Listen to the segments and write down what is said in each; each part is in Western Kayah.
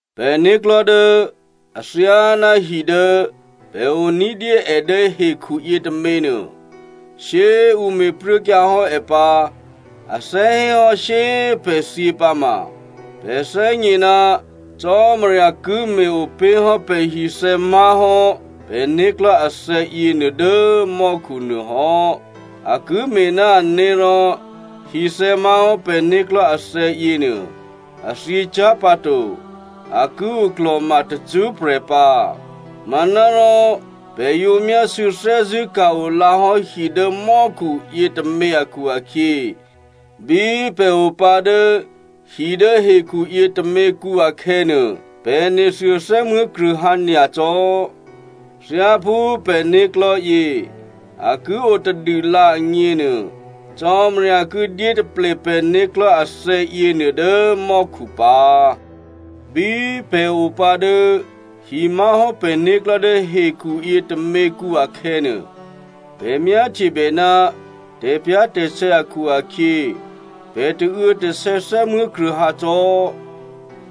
Pè̤né̤klò̤́ dố athyáná hi dố pè̤ o ní̤dyé è dố hekhu yětômě nuô, shyé꤮ ǔ me̤pruốkyǎ hò́ è pǎ, a thè́ hé hò́ shyé꤮ pè̤ thyě pǎma, pè̤ thè́gně ná Cò́marya ki me̤-opé̤ hò́ pè̤hithè̌ má̤hò́ pè̤né̤klò̤́ athè̌ yěnuô dố mò́khu nuô hò́. A ki me̤ ná ané̤ rò hithè̌ má̤hò́ pè̤né̤klò̤́ athè̌ yěnuô, a thyěcyá̤ pǎ to, a ki oklò̤ma tacṳ́prè̤ pǎ. Manárò, pè̤ yǒ myásû̌ thè́zṳ̂́ ka̤-o lǎhò́ hi dố mò́khu yětômě akhu-akhyě, bí pè̤ opǎ dố hi dố hekhuyě tôměkǔ akhè̌nuô, pè̤ nethuô thè́muố̤kruô̌hǎ nyacò́. Thyáphú pè̤né̤klò̤́ yě a ki o tadûlǎ agněnuô, Cò́marya ki dyé taple pè̤né̤klò̤́ athè̌ yěnuô dố mò́khu pǎ. Bí pè̤ opǎ dố hi má̤hò́ pè̤né̤klò̤́ dố hekhuyě tôměkǔ akhè̌nuô, pè̤ myáhtyebè ná tè̤pyá̤tè̤sè̌ akhu-akhyě, pè̤ tauô̌tasè̌ thè́muố̤kruô̌hǎ cò́.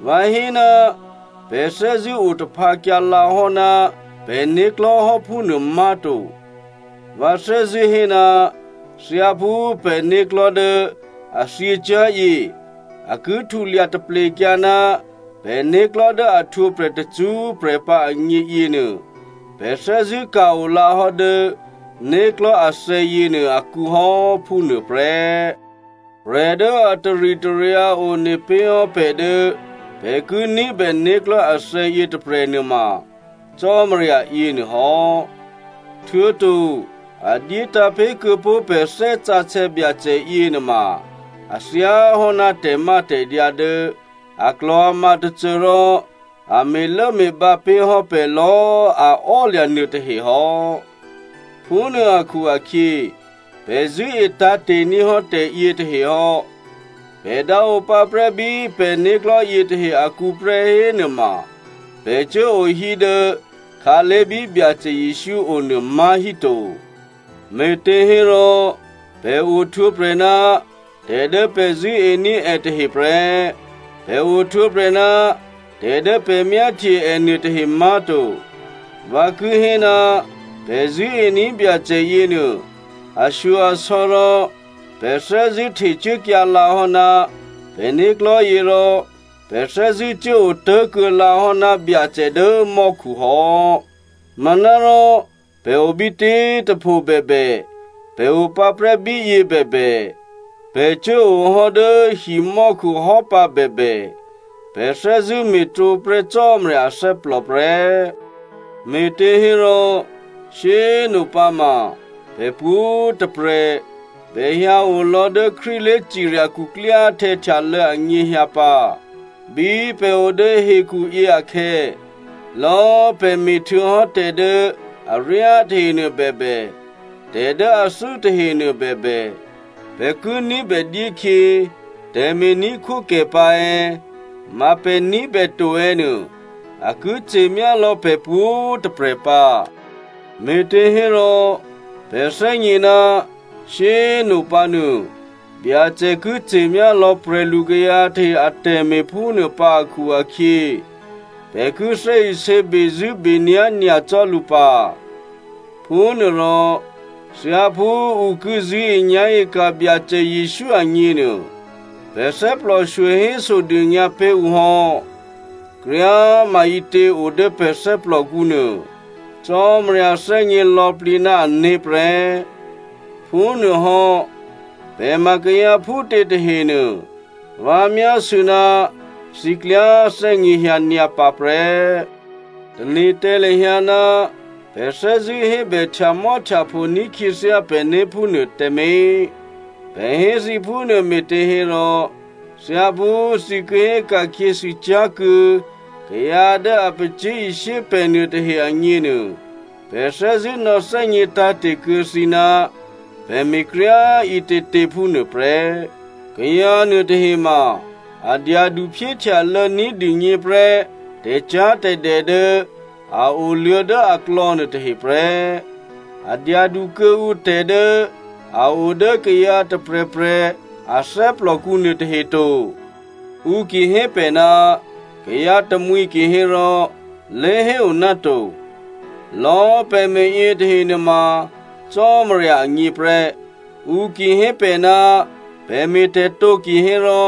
Vǎ hé ná pè̤ thè́zṳ̂́ otaphǎkyǎ lǎ hò́ ná pè̤né̤klò̤́ hò́ phúnuô má̤to. Vǎ thè́zṳ̂́ hé, thyáphú pè̤né̤klò̤́ dố a thyěcyá̤yě, a ki htulya taplekyǎ ná pè̤né̤klò̤́ dố a htwǒprè̤ tacṳ́prè̤ pǎ agně yěnuô, pè̤ thè́zṳ̂́ ka̤-o lǎ hò́ dố né̤klò̤́ athè̌ yěnuô akǔ hò́, phúnuô prè́. Prè̤ dố a taritaryǎ one pé̤ hò́ pè̤ dố pè̤ ki ní̤bè né̤klò̤́ athè̌ yětôprè̤ nuôma Cò́marya yěnuô hò́. Htuô̌to a dyétǎ̤ pé̤ kuô̌pó̤ pè̤ Thè́ Sǎsè̌ Byacè yěnuôma a thyáhò́ná tè̤mátè̤dyǎ dố aklò̤ama tôcô rò a me̤lốme̤bǎ pé̤ hò́ pè̤ lò̌꤮ a ò́lya̤ nuôtahe hò́. Phúnuô akhu-akhyě pè̤ zṳ̂́e tǎ̤te̤ ní̤ hò́ tè̤yětahe hò́. Pè̤ dǎ o pǎprè́ bí pè̤né̤klò̤́ yětahe akǔ prè́ hénuôma, pè̤ cuố o hí dố khǎlé̤ bí Byacè Jesǔ o nuô má̤ híto. Me̤těhérò pè̤ ohtwǒprè̤ ná tè̤ dố pè̤ zṳ̂́ení̤ è tahe prè́, pè̤ ohtwǒprè̤ ná tè̤ dố pè̤ myáhtye è nuôtahe má̤to. Vǎ ki hé, pè̤ zṳ̂́ení̤ Byacè yěnuô ashyo-asò̌ rò pè̤ thè́zṳ̂́ htecuốkyǎ lǎ hò́ ná pè̤né̤klò̤́ yě rò pè̤ thè́zṳ̂́cuố otố̤kuô̌ lǎ hò́ ná Byacè dố mò́khu hò́. Manárò, pè̤ o bítě꤮ tôpho bèbè, pè̤ o pǎprè́ bíyě bèbè, pè̤ cuố o hò́ dố himò́khu hò́ pǎ bèbè, pè̤ thè́zṳ̂́ me̤tǒ prè́ Cò́marya athè́plò prè́. Me̤těhérò, shyé꤮ nopǎma pè̤ pwǒ̤꤮ tôprè̤ bèhyǎ o lò̌ dố Krístu lé̤cirya khuklyáhtè̌ htyalô̌ anyěhyǎ pǎ. Bí pè̤ o dố hekhuyě akhè̌, lò̌꤮ pè̤ me̤htuô̌hò́ tè̤ dố aryá tahenuô bèbè, tè̤ dố athû́ tahenuô bèbè, pè̤ ki ní̤bè dyékhyě tè̤me̤ní̤khwókè pǎ è̌, ma pè̤ ní̤bè to è̌ nuô, a ki ce̤myá lò̌ pè̤ pwǒ̤꤮ tôprè̤ pǎ. Me̤těhérò pè̤ thè́gně ná shyé꤮ nopǎ nuô, Byacè ki ce̤myá lò̌ prè̤lukayǎ tahe atè̤me̤ phúnuô pǎ akhu-akhyě, pè̤ ki thè́isě bezṳ̂́benyá̤ nyacò́ lǔ pǎ. Phúnuôrò thyáphú ǔ ki zṳ̂́enyá̤e ka̤ Byacè Jesǔ agněnuô, pè̤ thè́plòshyo hésodônyǎ pé̤ ǔ hò́. Kryá꤮ maǐtě o dố pè̤ thè́plòkǔ nuô Cò́marya thè́gně lò̌plǐ ná ané̤ prè́. Phúnuôhò́, pè̤ ma kayǎ phútě tahenuô, vǎ myásû̌ ná thǐ klyá thè́gněhyǎ nyǎ pǎ prè́. Tane̤ tǎ lahyǎ ná pè̤ thè́zṳ̂́ hébè htyamò́htyapho ní̤ khyěthyá pè̤né̤ phúnuô tǎmé̤. Pè̤ hé thǐ phúnuô me̤těhérò thyáphú thǐ ki hé ka̤khyěsû cyá̤ kuô̌ kayǎ dố a pacyé̤ishyé pè̤ nuôtahe agněnuô, pè̤ thè́zṳ̂́ nò̌thè́gně tǎ̤te̤ kuô̌ thǐ ná pè̤ me̤kryá꤮ ǐtětě phúnuô prè́. Kayǎ nuôtahe ma a dyadu phyéhtyalô̌ ní̤dûgně prè́ tè̤cyá̤tè̤dè dố a oluô̌ dố aklò̌ nuôtahe prè́, a dyadu kuô̌ǔ tè̤ dố a o dố kayǎ tôprè̤prè̤ a thè́plòkǔ nuôtahe to. Ǔ ki hé pè̤ ná kayǎ tamwǐ kihérò, lé̤héo ná to, lò̌꤮ pè̤ me̤ yětahe nuôma Cò́marya agně prè́. Ǔ ki hé pè̤ ná pè̤ me̤tè̤ tǒ kihérò,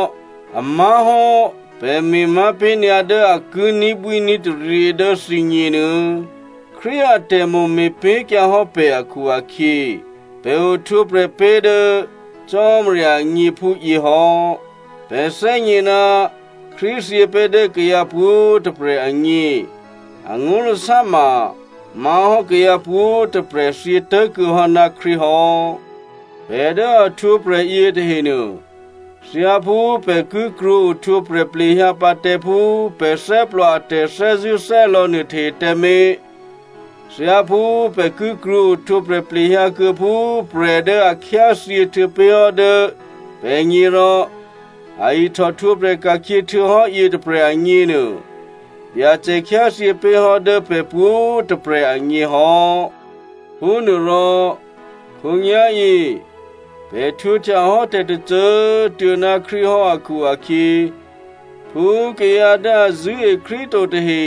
a má̤hò́, pè̤ me̤ má̤ pé̤ nyǎ dố a ki ní̤bwíní̤taryě dố thǐgněnuô̌. Krístu atè̤mo̤ me̤pé̤kyǎ hò́ pè̤ akhu-akhyě, pè̤ ohtwǒprè̤ pé̤ dố Cò́marya agně phúyě hò́. Pè̤ thè́gně ná Krístu thyě pé̤ dố kayǎ pwǒ̤꤮ tôprè̤ agně. Angó̤lasá ma má̤hò́ kayǎ pwǒ̤꤮ tôprè̤ thyě tố̤kuô̌ hò́ ná Krístu hò́. Pè̤ dố a htwǒprè̤ yětahenuô, thyáphú pè̤ ki krwǒ ohtwǒprè̤ plehyǎ pǎ tǎ phú pè̤ thè́plò a tè̤thè́zṳ̂́thè́lò̌ nuôtahe tǎmé̤, thyáphú pè̤ ki krwǒ ohtwǒprè̤ plehyǎ kuô̌ phú prè̤ dố a khyáthyě htuô̌pé̤hò́ dố pè̤gně rò a ihtòhtwǒprè̤ ka̤khyě htuô̌hò́ yětôprè̤ agněnuô, Byacè khyáthyě pé̤ hò́ dố pè̤ pwǒ̤꤮ tôprè̤ agně hò́. Phúnuôrò khǒnyá̤yě pè̤ htwǒhtya hò́ tè̤tôcô꤮ tuô̌ ná Krístu hò́ akhu-akhyě, phú kayǎ dố a zṳ̂́e Krístu to tahe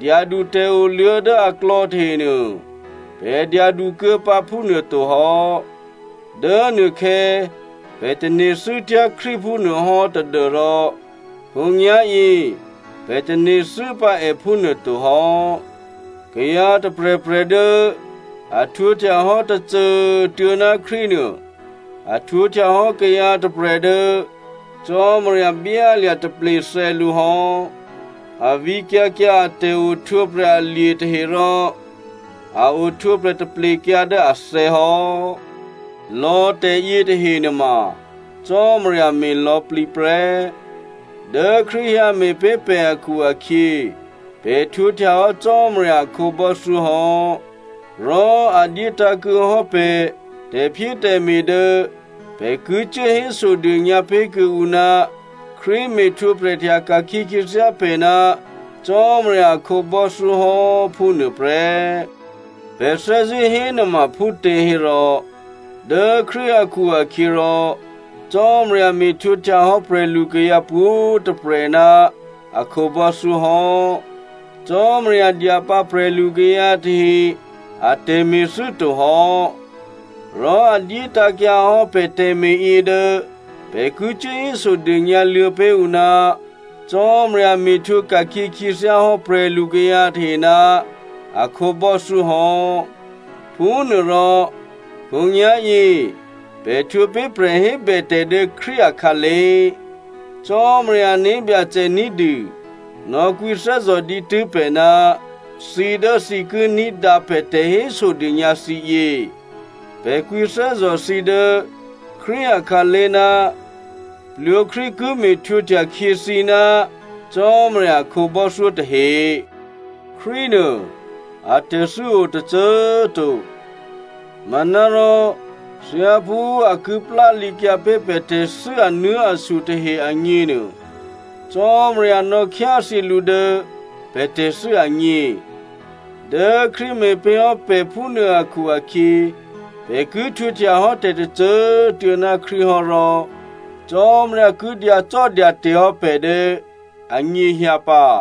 dyadu tè̤oluô̌ dố aklò̌ tahenuô, pè̤ dyadukuô̌ pǎ phúnuôto hò́. Dố nuôkhè̌ pè̤ tane̤thû́tyá̤ Krístu phúnuôhò́ tadû́rò khǒnyá̤yě pè̤ tane̤thû́ pǎ è phúnuô to hò́. Kayǎ tôprè̤prè̤ dố a htwǒhtya hò́ tôcô꤮ tuô̌ ná Krístu nuô, a htwǒhtya hò́ kayǎ tôprè̤ dố Cò́marya byálya̤ taple thè̌ lǔ hò́. A vǐkyǎ kyǎ a tè̤ohtwǒprè̤ alye̤ tahe rò a ohtwǒprè̤ taplekyǎ dố athè̌ hò́. Lò̌ tè̤yětahe nuôma Cò́marya me̤ lò̌plǐ prè́. Dố Krístu hyǎ me̤pé̤ pè̤ akhu-akhyě, pè̤ htwǒhtya hò́ Cò́marya a khǒbò́thyó hò́. Rò a dyétǎ̤kuô̌ hò́ pè̤ tè̤phyétè̤me̤ dố pè̤ ki cuố hésodônyǎ pé̤ kuô̌ǔ ná Krístu me̤htwǒhtya ka̤khyě khyěthyá pè̤ ná Cò́marya a khǒbò́thyó hò́, phúnuô prè́. Pè̤ thè́zṳ̂́ hénuôma phútěhérò, dố Krístu akhu-akhyěrò Cò́marya me̤htwǒhtya hò́ prè̤lukayǎ pwǒ̤꤮ tôprè̤ ná a khǒbò́thyó hò́. Cò́marya dya pǎ prè̤lukayǎ tahe a tè̤me̤thû́ to hò́. Rò a dyétǎ̤kyǎ hò́ pè̤ tè̤me̤yě dố pè̤ ki cuố hésodônyǎ luô̌ pé̤ ǔ ná Cò́marya me̤htwǒka̤khyě khyěthyá hò́ prè̤lukayǎ tahe ná a khǒbò́thyó hò́. Phúnuôrò, khǒnyá̤yě pè̤ htwǒ pé̤ prè̤hébètè̤ dố Krístu akhǎlé̤. Cò́marya ané̤byacè ní̤dû nò̌kwǐthè́zò̤ dǐtû́ pè̤ ná thǐ dố thǐ ki ní̤dǎ pè̤ tè̤hésodônyǎ thǐ yě. Pè̤ kwǐthè́zò̤ thǐ dố Krístu akhǎlé̤ ná plwǒ Krístu ki me̤htwǒhtya khyě thǐ ná Cò́marya a khǒbò́thyó tahe. Krístunuô atè̤thû́ o tôcô꤮ to. Manárò, thyáphú a ki plálǐkyǎ pé̤ pè̤ tè̤thû́ anuố̤asu tahe agněnuô, Cò́marya nò̌khyáthyě lǔ dố pè̤ tè̤thû́ agně. Dố Krístu me̤pé̤ hò́ pè̤ phúnuô akhu-akhyě, pè̤ ki htwǒhtya hò́ tè̤tôcô꤮ tuô̌ ná Krístu hò́ rò, Cò́marya ki dyacò́dyate̤ hò́ pè̤ dố anyěhyǎ pǎ.